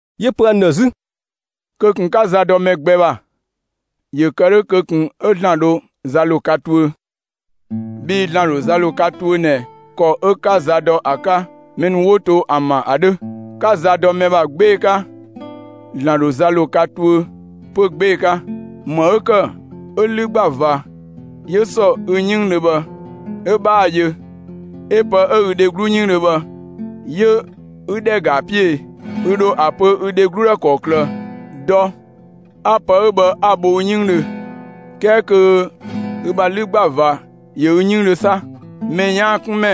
'Yö‑ pö ‑an ‑dhë 'zü: «Kö ꞊kun 'ka za dɔ mɛ gbɛ ‑bha! ‑Yö kë 'dhö, kö ꞊kun 'ö ‑Zlan dho za ‑lo ka tuö. Bhii ‑Zlan ‑dho za ‑lo ka tuö ꞊nɛ ‑kɔ 'ö 'ka za dɔ ‑a 'ka mɛ ‑nu 'wo to ‑an ‑bha ‑a 'dhö. 'Ka za dɔ mɛ ‑bha 'gbee‑ 'ka, ‑Zlan ‑dho za ‑lo ka tuö 'pö 'gbee‑ 'ka. ‑Më 'ö ‑kë 'ö 'lü ‑gba ꞊va 'yö ‑sɔ ü 'yënngdhö bhë 'ö 'bhaa‑ yö, 'ö‑ pë 'ö dho ü dheglu 'yënngdhö bhë, 'yö 'ü ‑dhɛ ‑ga ‑a 'piö e? Ü ‑dho ‑a pö ü dheglu ‑dhë ‑kɔklë: ‹Dɔ, 'a pë 'ö bhë 'a‑ bho ü 'yënngdhö!›, 'kɛɛ kö ü ‑bha 'lü ‑gba ꞊va ‑yö ü 'yënngdhö 'sa? Mɛ 'yaan‑ 'kun ‑mɛ,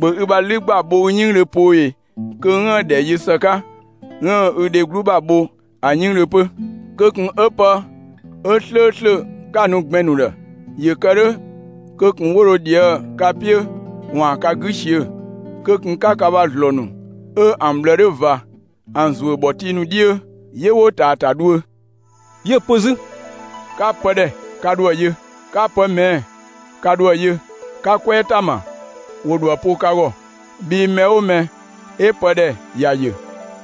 ‑bhö ü ‑bha 'lü ‑gba bho ü 'yënngdhö poo ꞊e, kö 'üën‑ ‑dhɛ yö ‑së 'ka, 'üën‑ ü dheglu ‑bha bho ‑a 'yënngdhö 'pö! Kö ꞊kun 'ö pë 'ö 'slööslö 'ka‑ nu gbɛn‑ ‑nu ‑dhë! ‑Yö kë 'dhö, kö ꞊kun 'wo dho ꞊dhië' ka 'piö ‑waan ka 'gü ꞊siö'‑. Kö ꞊kun 'ka ka ‑bha ‑zlɔɔ ‑nu 'ö ‑an ꞊bhlë 'dhö ꞊va, ‑an ‑zuö ‑bhɔtii ‑nu 'dhiö! 'Yö 'wo ꞊taa' ‑a ‑ta dhuö.» 'Yö‑ pö 'zü: «'Ka pë ‑dhɛ, ka ‑dho ‑a yö! 'Ka pë ꞊mɛɛ'‑, ka ‑dho ‑a yö! 'Ka 'kwɛɛ ‑ta ‑ma, ‑wo ‑dho ‑a po ka ‑gɔ! Bhii mɛ 'oo mɛ 'ö pë ‑dhɛ, ‑ya yö,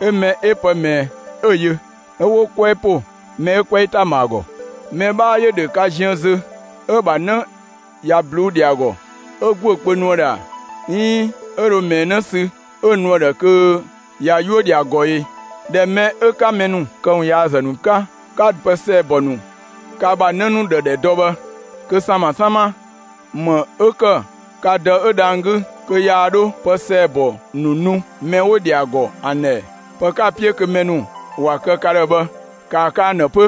'ö mɛ 'ö pë ꞊mɛɛ 'ö‑ yö, 'ö 'wo 'kwɛɛ ‑po mɛ 'ö 'kwɛɛ ‑ta ‑ma ‑a ‑gɔ. Mɛ 'bhaa ‑yö ‑dhö ka ziën zö, 'ö‑ ‑bha 'në ꞊ya ꞊bluu'‑ ‑dhɛ ‑a ‑gɔ, 'ö ‑guö kpö nu ‑a ‑dhë ‑a? 'Iin 'ö dhö ꞊mɛɛ 'në sü 'ö‑ nu ‑a ‑dhë kö ꞊ya 'yuö‑ ‑dhɛ ‑a ‑gɔ ‑e? ꞊Dhɛ mɛ 'ö 'ka mɛ ‑nu këwunyaazë ‑nu 'ka, 'ka dɔ pë ‑sɛɛbɔ ‑nu ka ‑bha 'në ‑nu ‑dhë ‑dhɛ ‑dɔ bhë, kö ‑sama 'sama, ‑më 'ö ‑kë ka Dë 'ö dhang‑ 'gü, 'yaa 'dho pë ‑sɛɛbɔ ‑nu nu mɛ 'wo‑ ‑dhɛ ‑a ‑gɔ ‑an ‑dhë ‑ɛ? Pë 'ka‑ 'piö kö mɛ ‑nu ‑wa kë ka ‑dhë bhë, ‑kaa kë ‑an ‑dhë 'pö!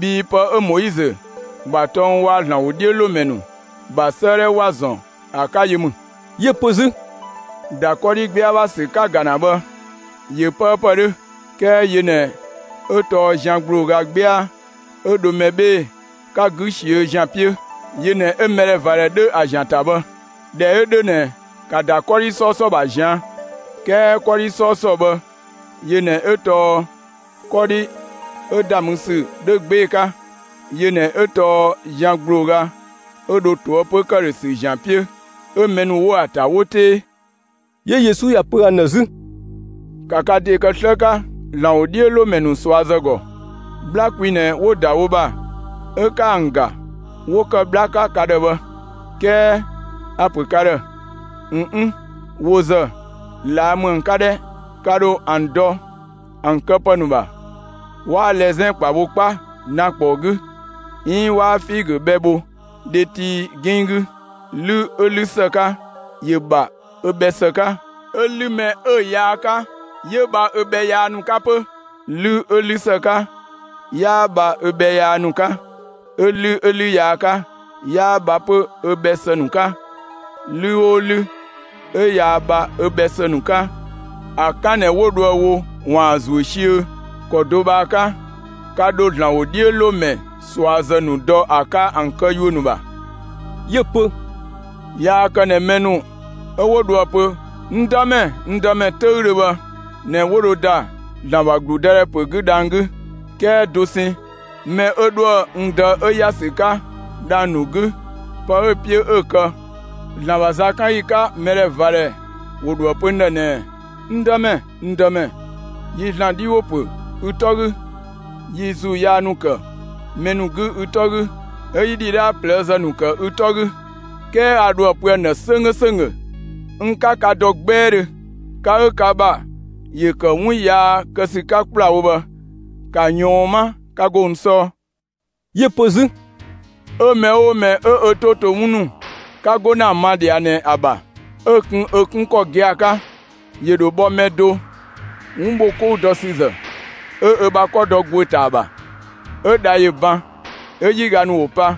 Bhii pë 'ö Moizö ‑bha tɔng waa‑ ‑Zlan ‑wodhiölomɛ ‑nu ‑bha 'sëëdhɛ ‑wa ‑zɔn ‑a 'ka yö ‑mü.» 'Yö‑ pö 'zü: «‑Da 'kɔdhi 'gbɛa ‑bha ‑sü 'ka‑ ‑ga ‑na bhë, ꞊yö 'pëëpë 'dhö; 'kɛɛ yö ꞊nɛ 'ö tɔɔ zian ‑gblooga 'gbɛa 'ö dho mɛ 'bhee‑ 'ka 'gü ꞊siö' ‑zian 'piö; yö ꞊nɛ 'ö mɛdhɛvadhɛ dhö ‑a ‑zian ‑ta bhë. ꞊Dhɛ 'ö 'dhö ꞊nɛ, ‑ka ‑da 'kɔdhi 'sɔɔsɔ ‑bha ꞊zian'! 'Kɛɛ 'kɔdhi 'sɔɔsɔ bhë, yö ꞊nɛ 'ö tɔɔ 'kɔdhi 'ö‑ ‑da mü ‑sü 'dhö 'gbee‑ 'ka. Yö ꞊nɛ 'ö tɔɔ zian ‑gblooga 'ö dho ꞊toëpö ‑këdhösü ‑zian 'piö, 'ö mɛ ‑nu 'wo‑ ‑ta, 'wo 'tee.» 'Yö Yesu ‑ya pö ‑an ‑dhë 'zü: «‑Ka ka ‑de kë 'slë 'ka ‑Zlan ‑wodhiölomɛ ‑nu ꞊suazë ‑gɔ! 'Bhla kwi ꞊nɛ 'wo‑ ‑da wo ‑bha 'ö 'ka ‑an ‑ga, 'wo ‑kë 'bhla 'ka ka ‑dhë bhë, 'kɛɛ a‑ ‑pö ka ‑dhë: ꞊N 'n; wo ‑zë, ꞊laa' ‑mü ‑an 'ka 'dhɛ! Ka ‑dho ‑an dɔ ‑an këpë ‑nu ‑bha. 'Waa lɛzɛn ‑kpa bho 'kpa dan ‑kpɔɔ 'gü, 'iin 'waa figö bhɛ bho dhetii 'ginng 'gü. 'Lü 'ö 'lü ‑së 'ka, ‑yö ‑bha ö bhɛ ‑së 'ka, 'ö 'lü mɛ 'ö‑ yaa 'ka, 'yö bha ö bhɛ yaa ‑nu 'ka 'pö. 'Lü 'ö 'lü ‑së 'ka, 'yaa bha ö bhɛ yaa ‑nu 'ka; 'ö 'lü 'ö 'lü yaa 'ka, 'yaa bha 'pö ö bhɛ ‑së ‑nu 'ka. 'Lü 'oo 'lü 'ö yaa bha ö bhɛ ‑së ‑nu 'ka, ‑a 'kan ꞊nɛ 'wo dho ‑a wo ‑waan ‑a ‑zuö siöö. ‑Kɔ do bhë ‑a 'ka, ka dho ‑Zlan ‑wodhiölomɛ ꞊suazë ‑nu dɔ ‑a 'ka ‑an këyuö ‑nu ‑bha.» 'Yö‑ pö: «Yaa kë ꞊nɛ mɛ ‑nu 'ö 'wo dho ‑a pö ‹N Dëmɛ, n Dëmɛ› 'töüdhö bhë ꞊nɛ 'ö 'wo dho ‑da ‑Zlan ‑bha ‑gludëdhɛ 'gü dhang‑ 'gü; 'kɛɛ dosɛn mɛ 'ö 'dhoë‑ n Dë 'ö ‑ya ‑sü 'ka dhang‑ ‑nu 'gü, pë 'ö‑ 'piö 'ö‑ kë. ‑Zlan ‑bha zakanyi 'ka, mɛdhɛvadhɛ ‑wo ‑dho ‑a pö n ‑dhë ꞊nɛɛ: ‹N Dëmɛ, n Dëmɛ, yi ‑Zlan 'dhi ‑wo ‑pö ü 'tɔ 'gü, yi ‑zuu yaa ‑nu ‑kë mɛ ‑nu 'gü ü 'tɔ 'gü, 'ö 'yi ‑dhidhaa ꞊plëëzë ‑nu ‑kë ü 'tɔ 'gü›. 'Kɛɛ a ‑dho ‑a pö ‑an ‑dhë 'sönggö ‑sönggö: ‹N 'ka ka dɔ 'gbɛɛdhö, ka 'ö ka ‑bha ‑yö ‑kë 'wun yaa kë ‑sü 'ka ‑kplawo bhë, ‑ka ꞊yɔɔn 'ma, 'ka 'go n 'sɔɔ!›» 'Yö‑ pö 'zü: «'Ö mɛ 'oo mɛ 'ö ö 'to to 'wun ‑nu 'ka 'go ‑na ‑a ma ꞊dhia ꞊nɛ ‑a ‑bha, 'ö‑ kun ‑a 'kun ‑kɔ gia‑ 'ka, ‑yö ‑dho bhɔ mɛ do 'wun ‑bho 'kou dɔ ‑sü ‑zë, 'ö ö ‑bha 'kɔ dɔ ‑guö ‑ta ‑a ‑bha. 'Ö dha ‑yö ban, 'ö 'yiga ‑nu ‑wo pa,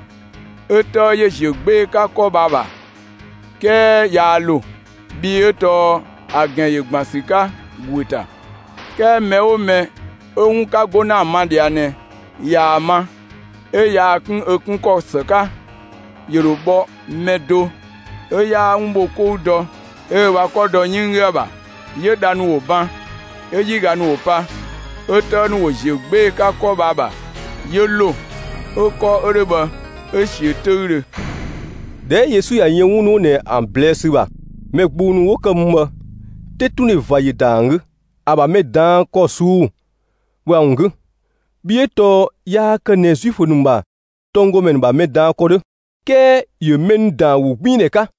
'ö 'tëë ‑yö ‑ziö 'gbee‑ 'ka 'kɔ bhë ‑a ‑bha, 'kɛɛ yaa ‑lo, bhii 'ö tɔɔ ‑a ‑gɛn ‑yö ‑gban ‑sü 'ka ‑guö ‑ta. 'Kɛɛ mɛ 'oo mɛ 'ö 'wun 'ka 'go ‑na ‑a ma ꞊dhia ꞊nɛ, ꞊yaa‑ ma 'ö yaa‑ 'kun ‑a 'kun ‑kɔ ‑së 'ka, ‑yö ‑dho bhɔ mɛ do 'ö 'yaa 'wun ‑bho 'kou dɔ 'ö ö ‑bha 'kɔ dɔ 'yënng 'gü ‑a ‑bha. 'Yö dha ‑nu ‑wo ‑ban, 'ö 'yiga ‑nu ‑wo pa, 'ö 'tëë ‑nu ‑wo ‑ziö 'gbee‑ 'ka 'kɔ bhë ‑a ‑bha, 'yö ‑lo. 'Ö 'kɔ 'ö 'dhö bhë, 'ö‑ ꞊siö' 'töüdhö.» ꞊Dhɛ 'ö Yesu ꞊ya yën 'wun ‑nu 'wo ꞊nɛ ‑an ꞊blɛɛ'‑ ‑sü ‑bha, mɛ gbung ‑nu 'wo ‑kë mü bhë, 'tetundhe ꞊va ‑yö ‑da ‑an 'gü, ‑a ‑bha mɛ ꞊daan' ‑kɔ ꞊suu'‑ bhë ‑a ‑wun 'gü. Bhii 'ö tɔɔ yaa kë ꞊nɛ Zuifö ‑nu ‑bha tɔnggɔmɛ ‑nu ‑bha mɛ ꞊daan' ‑kɔ 'dhö, 'kɛɛ ‑yö mɛ ‑nu ‑daan ‑wogbiindhɛ 'ka.